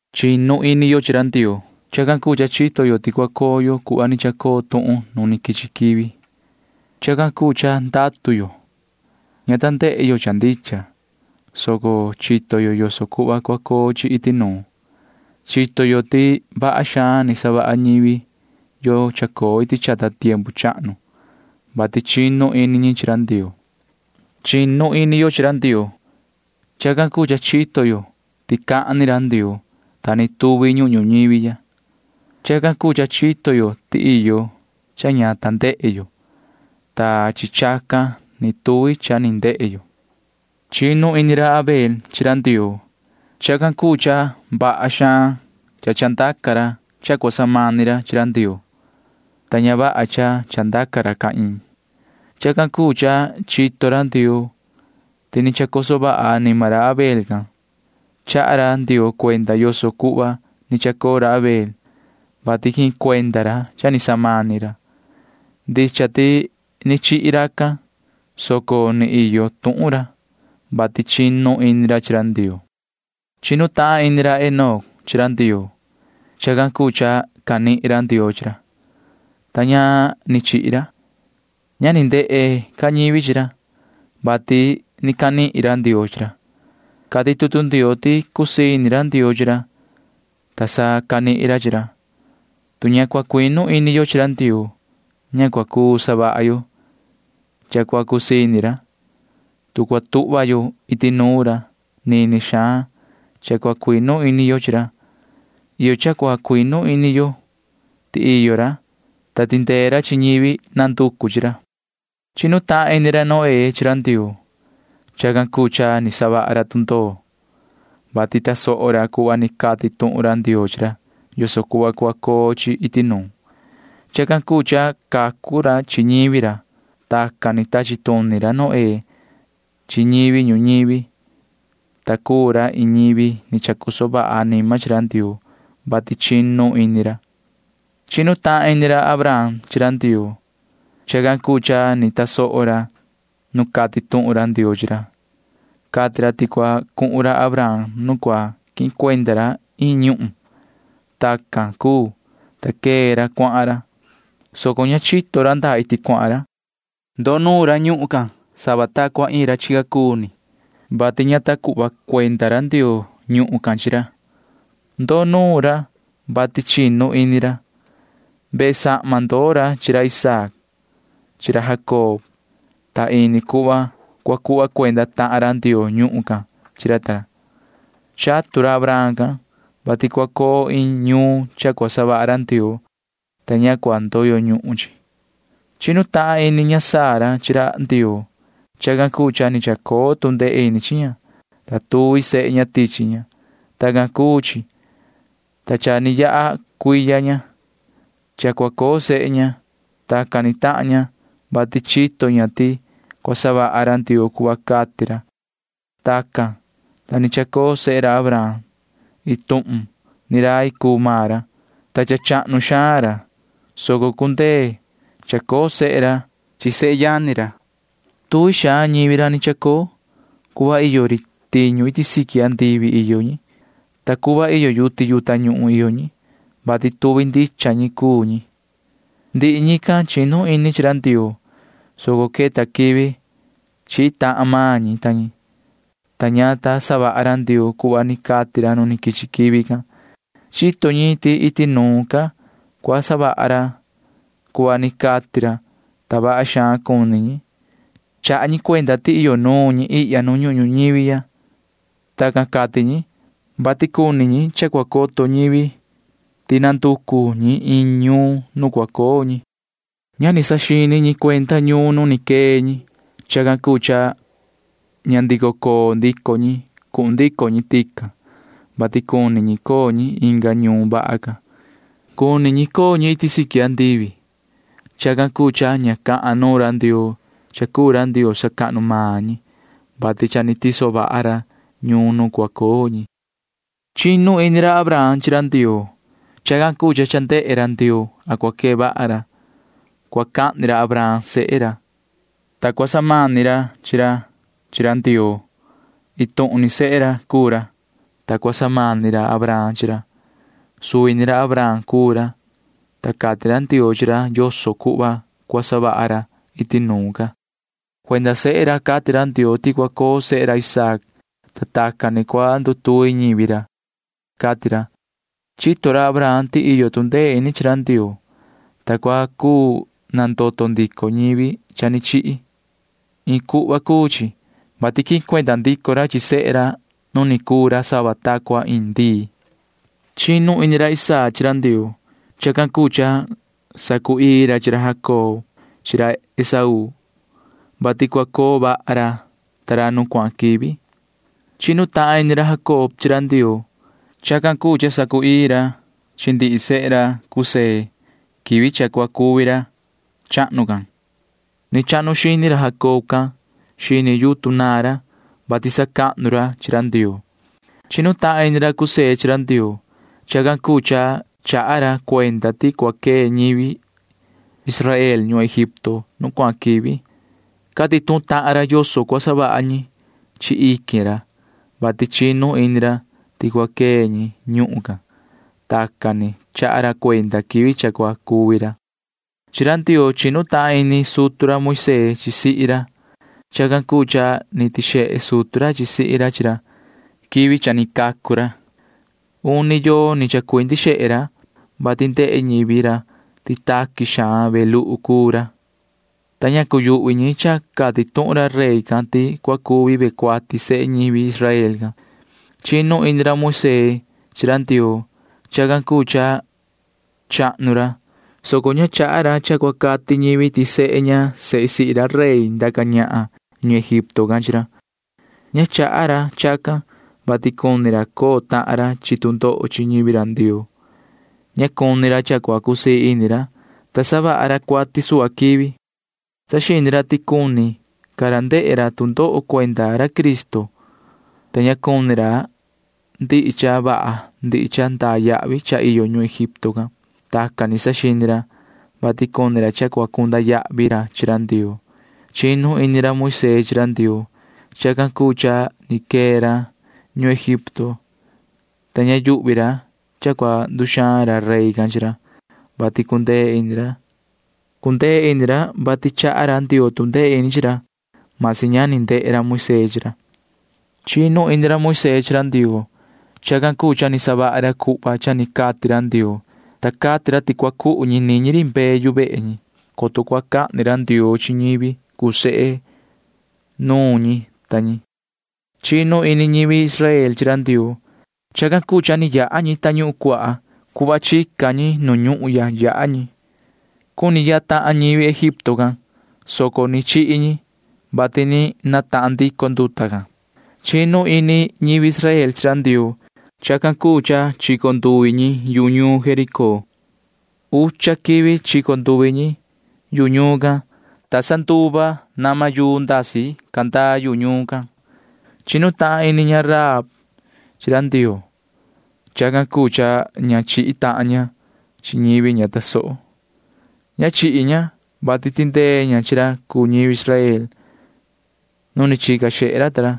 Chinu ini yo chi ra Ndioo. Chacan cuu cha chito yo ti cua coo yo cuhva ni chacoo tuhun nu quichi quivi. Chacan cuu cha ndatu yo. Ña ta ndehe yo cha ndicha, soco chito yo yoso cuhva cua coo chi iti nuun. Chito yo ti vaha xaan ni savaha ñivi yo chacoo iti chata tiempu chahnu, vati chinu ini ñi chi ra Ndioo. Chinu ini yo chi ra Ndioo. Chacan cuu cha chito yo ti ni cahan ra Ndioo, ta ni tuvi ñuhun ñuñivi ya. Chacan cuu cha chito yo ti iyo cha ña ndehe yo, ta chi chacan ni tuvi cha ni ndehe yo. Chinu ini ra Abel chi ra Ndioo. Chacan cuu cha vaha xaan chandaca ra cha cua samani ra chi ra Ndioo, ta ña vaha cha chandaca ra Caín. Chacan cuu cha chito ra Ndioo ti ni chacoso vaha anima ra Abel can. Chaha ra Ndioo cuenda yoso cuhva ni chacoo ra Abel, vati quihin cuenda ra cha ni samani ra. Ndicha ti ni chihi racan, soco ni iyo tuhun ra, vati chinu ini ra chi Ndioo. Chinu tahan ini ra Enoc chi ra Ndioo. Chacan cuu cha canihin ra Ndioo chi ra, ta ña ni chihi ra. Ña ni ndehe ca ñivi chi ra, vati ni canihin ra Ndioo chi ra. Cati tutu Ndioo ti cusii ini ra Ndioo chi ra, ta sa canihin ra chi ra. Tu ña cua cuinu ini yo chi ra Ndioo, ña cua cuu savaha yo cha cua cusii ini ra. Tu cua tuhva yo iti nuun ra, nini xaan cha cua cuinu ini yo chi ra. Iyo cha cua cuinu ini yo ti iyo ra, ta tindee ra chi ñivi nanducu chi ra. Chinu tahan ini ra Noé chi ra Ndioo. Chacan cuu cha ni savaha ra tundoo, vati tasoho ra cuhva ni cati tuhun ra Ndioo chi ra yoso cuhva cua coo chi iti nuun. Chacan cuu cha cacu ra chi ñivi ra. Tacan ni tachi tuni ra Noé chi ñivi ñuñivi, ta cuu ra iin ñivi ni chacoso vaha anima chi ra Ndioo, vati chinu ini ra. Chinu tahan ini ra Abraham chi ra Ndioo. Chacan cuu cha ni tasoho ra nu cati tuhun ra Ndioo chi ra. Cati ra ti cua cuhun ra Abraham nu cua quihin cuenda ra iin ñuhun. Tacan cuu, ta quee ra cuahan ra, soco ña chito ra ndaa iti cuahan ra. Ndoo nuun ra ñuhun can sava ta cua iin ra chica cuu ni, vati ña ta cuhva cuenda ra Ndioo ñuhun can chi ra. Ndoo nuun ra, vati chinu ini ra. Vehe sahma ndoo ra chi ra Isaac chi ra Jacob, ta ini cuhva cua cuhva cuenda tahan ra Ndioo ñuhun can chi ra ta ra. Chatu ra Abraham can, vati cua coo iin ñuun cha cua savaha ra Ndioo, ta ña cua ndoyo ñuhun chi. Chinu tahan ini ña Sara chi ra Ndioo. Chacan cuu cha ni chacoo tu ndee ini chi ña, ta tuvi sehe ña tichi ña. Tacan cuu chi, ta cha ni yaha cuiya ña cha cua coo sehe ña. Tacan ni tahan ña, vati chito ña ti cua savaha ra Ndioo cuhva cati ra. Tacan, ta ni chacoo sehe ra Abraham. Iin tuhun ni rai cuu maan ra, ta cha chahnu xaan ra, soco cundee cha chacoo sehe ra chi sehe yani ra. Tuvi xaan ñivi ra ni chacoo. Cuhva iyo ri tiñu iti siqui andivi iyo ñi, ta cuhva iyo yuti yu tañuhun iyo ñi, [vati tuvi ndicha ñi cuu ñi]. Ndihi ñican chinu ini chi ra Ndioo, soco queta quivi chihi tahan maan ñi ta ñi, ta ña ta savaha ra Ndioo cuhva ni cati ra nu quichi quivi can. Chito ñi ti iti nuun ca cua savaha ra cuhva ni cati ra, ta vaha xaan cuni ñi. Chaha ñi cuenda ti iyo nuun ñi ihya nu ñuhun ñuñivi ya. Tacan cati ñi, vati cuni ñi cha cua coto ñivi ti nanducu ñi iin ñuun nu cua coo ñi. Ña ni saxini ñi cuenda ñuun nu ni quee ñi. Chacan cuu cha ña ndico coo ndico ñi cuhun ndico ñi tican, vati cuni ñi coo ñi inga ñuun vaha ca. Cuni coo ñi iti siqui andivi. Chacan cuu cha ña cahan nuun ra Ndioo cha cuu ra Ndioo sacahnu maan ñi, vati cha ni tiso vaha ra ñuun nu cua coo ñi. Chinu ini ra Abraham chi ra Ndioo. Chacan cuu cha cha ndehe ra Ndioo a cua quee vaha ra. Cua cahni ra Abraham sehe ra, ta cua samani ra chi ra chi ra Ndioo. Iin tuhun ni sehe ra cuu ra, ta cua samani ra Abraham chi ra. Suvi ni ra Abraham cuu ra, ta cati ra Ndioo chi ra yoso cuhva cua savaha ra iti nuun ca. Cuenda sehe ra cati ra Ndioo ti cua coo sehe ra Isaac, ta tacan ni cua ndutuvi ñivi ra, cati ra. Chito ra Abraham ti iyo tu ndee ini chi ra Ndioo, ta cua cuu nandoto ndico ñivi cha ni chihi. Iin cuhva cuu chi, vati quihin cuenda ndico ra chi sehe ra nu ni cuu ra sava ta cua iin ndii. Chinu ini ra Isaac chi ra Ndioo. Chacan cuu cha sacu‑ii ra chi ra Jacob chi ra Esaú, vati cua coo vaha ra ta ra nu cuahan quivi. Chinu tahan ini ra Jacob chi ra Ndioo. Chacan cuu cha sacu‑ii ra chi ndihi sehe ra José quivi cha cua cuvi ra chahnu can. Ni chahnu xini ra Jacob can xini yutun naan ra, [vati sacahnu ra chi ra Ndioo]. Chinu tahan ini ra José chi ra Ndioo. Chacan cuu cha chaha ra cuenda ti cua quee ñivi Israel ñuhun Egipto nu cuahan quivi. Cati tuhun tahan ra yoso cua savaha ñi chi iquin ra, vati chinu ini ra ti cua quee ñi ñuhun can. Tacan ni chaha ra cuenda quivi cha cua cuvi ra. Chi ra Ndioo chinu tahan ini sutu ra Moisee chi sihi ra. Chacan cuu cha ni tixehe sutu ra sihi ra chi ra quivi cha ni cacu ra. Uni yoo ni chacuindi xehe ra, vati ndehe ñivi ra ti taqui xaan ve luhu cuu ra, ta ña cuyuhvi ñi cha cati tuhun ra rey can ti cua cuvi ve cuati sehe ñivi Israel can. Chinu ini ra Moisee chi ra Ndioo. Chacan cuu cha chahnu ra, soco ña chaha ra cha cua cati ñivi ti sehe ña sehe sihi ra rey ndaca ñahan ñuhun Egipto can chi ra. Ña chaha ra chacan, vati cuni ra coo tahan ra chi tu ndoho chi ñivi ra Ndioo. Ña cuni ra cha cua cusii ini ra, ta savaha ra cuati suhva quivi. Saxini ra ti cuni ca ra ndehe ra tu ndoho cuenda ra Cristo, ta ña cuni ra ndihi cha vaha ndihi cha ndaa yahvi cha iyo ñuhun Egipto can. Tacan ni saxini ra, vati cuni ra cha cua cunda yahvi ra chi ra Ndioo. Chinu ini ra Moisee chi ra Ndioo. Chacan cuu cha ni quee ra ñuhun Egipto, ta ña yuhvi ra cha cua nduxaan ra rey can chi ra, vati cundee ini ra. Cundee ini ra, vati chaha ra Ndioo tu ndee ini chi ra―masi ña ni ndehe ra Moisee chi ra. Chinu ini ra Moisee chi ra Ndioo. Chacan cuu cha ni savaha ra cuhva cha ni cati ra Ndioo, ta cati ra ti cua cuhu ñi niñi ri mbee yu vehe ñi, coto cua cahni ra Ndioo chi ñivi cuu sehe nuun ñi ta ñi. Chinu ini ñivi Israel chi ra Ndioo. Chacan cuu cha ni yaha ñi Tañuhun Cuaha. Cuhva chica ñi nu ñuhun yaha ñi. Cuni yaha tahan ñivi Egipto can, soco ni chihi ñi, vati ni natahan ndico nduta can. Chinu ini ñivi Israel chi ra Ndioo. Chacan cuu cha chico nduvi ñi yu ñuun Jericó. Ucha quivi chico nduvi ñi yu ñuun can, ta sa nduva nama yuu ndasi candaa yuhu ñuun can. Chinu tahan ini ña Rahab chi ra Ndioo. Chacan cuu cha ña chihi tahan ña chi ñivi ña tasoho. Ña chihi ña, vati tindee ña chi ra cuu ñivi Israel nu ni chica xehe ra ta ra,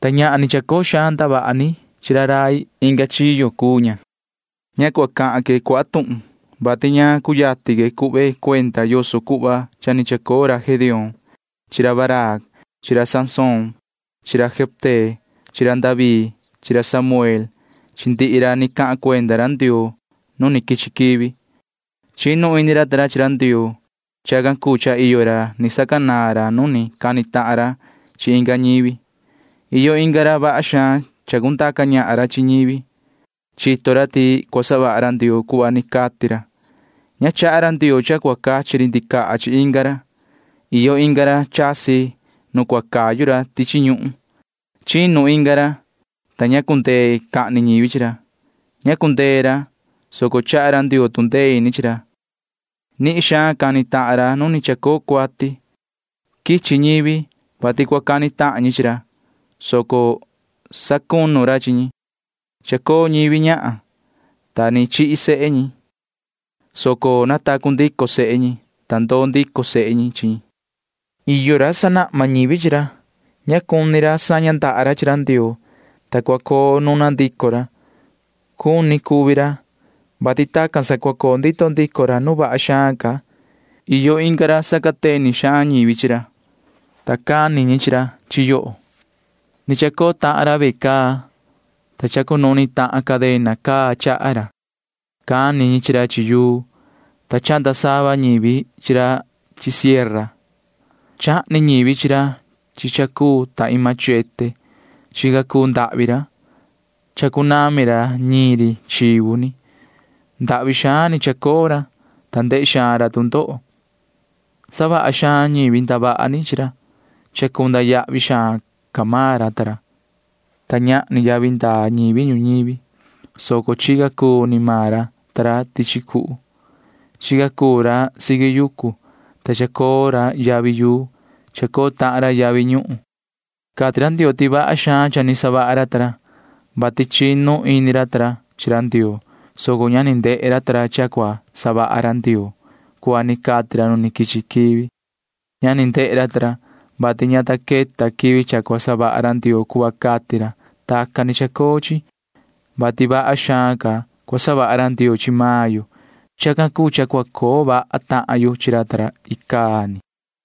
ta ñahan ni chacoo xaan ndavaha ni chi ra rai inga chiyo cuu ña. Ña cua cahan que cuaha tuhun, vati ña cuyatin que cuhve cuenda yoso cuhva cha ni chacoo ra Gedeón chi ra Barac chi ra Sansón chi ra Jefté chi ra David chi ra Samuel chi ndihi ra ni cahan cuenda ra Ndioo nu ni quichi quivi. Chinu ini ra ta ra chi ra Ndioo. Chacan cuu cha iyo ra ni sacanaan ra nu ni cani tahan ra chi inga ñivi. Iyo inga ra vaha xaan chacundaca ñahan ra chi ñivi. Chito ra ti cua savaha ra Ndioo cuhva ni cati ra. Ña chaha ra Ndioo cha cua cachi ri ndicaha chi inga ra. Iyo inga ra chasi nu cua cayu ra tichi ñuhun. Chinu inga ra, ta ña cundee cahni ñivi chi ra. Ña cundee ra, soco chaha ra Ndioo tu ndee ini chi ra. Nihin xaan cani tahan ra nu ni chacoo cuati. Quichi ñivi, vati cua cani tahan ñi chi ra, soco sacunu ra chi ñi. Chacoo ñivi ñahan, ta ni chihi sehe ñi, soco natacu ndico sehe ñi, ta ndoo ndico sehe ñi chi ñi. Iyo ra―sanahma ñivi chi ra. Ña cuni ra saña ndaha ra chi ra Ndioo, ta cua coo nuna ndico ra. Cuni cuvi ra, vati tacan sa cua coo ndito ndico ra nu vaha xaan ca. Iyo inga ra sacateni xaan ñivi chi ra, ta cani ñi chi ra chi yoho. Ni chacoo tahan ra ve caa, ta chacunuhni tahan cadena caa chaha ra. Cani ñi chi ra chi yuu, ta chahnda sava ñivi chi ra chi sierra. Chahni ñivi chi ra chi cha cuu ta iin machete. Chica cuu ndahvi ra, ta chacunami ra ñiin ri chivu ni. Ndahvi xaan ni chacoo ra, ta ndehe xaan ra tu ndoho. Savaha xaan ñivi ndavaha ni chi ra. Chacunda yahvi xaan ca maan ra ta ra, ta ñahni yavi ndaa ñivi ñuñivi, soco chica cuu ni maan ra ta ra tichi cuhu. Chica cuu ra siqui yucu, ta chacoo ra yavi yuu. Chacoo tahan ra yavi ñuhun. Cati ra Ndioo ti vaha xaan cha ni savaha ra ta ra, vati chinu ini ra ta ra chi ra Ndioo, soco ña ni ndehe ra ta ra cha cua savaha ra Ndioo cuhva ni cati ra nu quichi quivi. [Ña ni ndehe ra ta ra, vati ña ta queta quivi cha cua savaha ra Ndioo cuhva cati ra.] Tacan ni chacoo chi, vati vaha xaan ca cua savaha ra Ndioo chi maan yo. Chacan cuu cha cua coo vaha tahan yo chi ra ta ra icaa ni.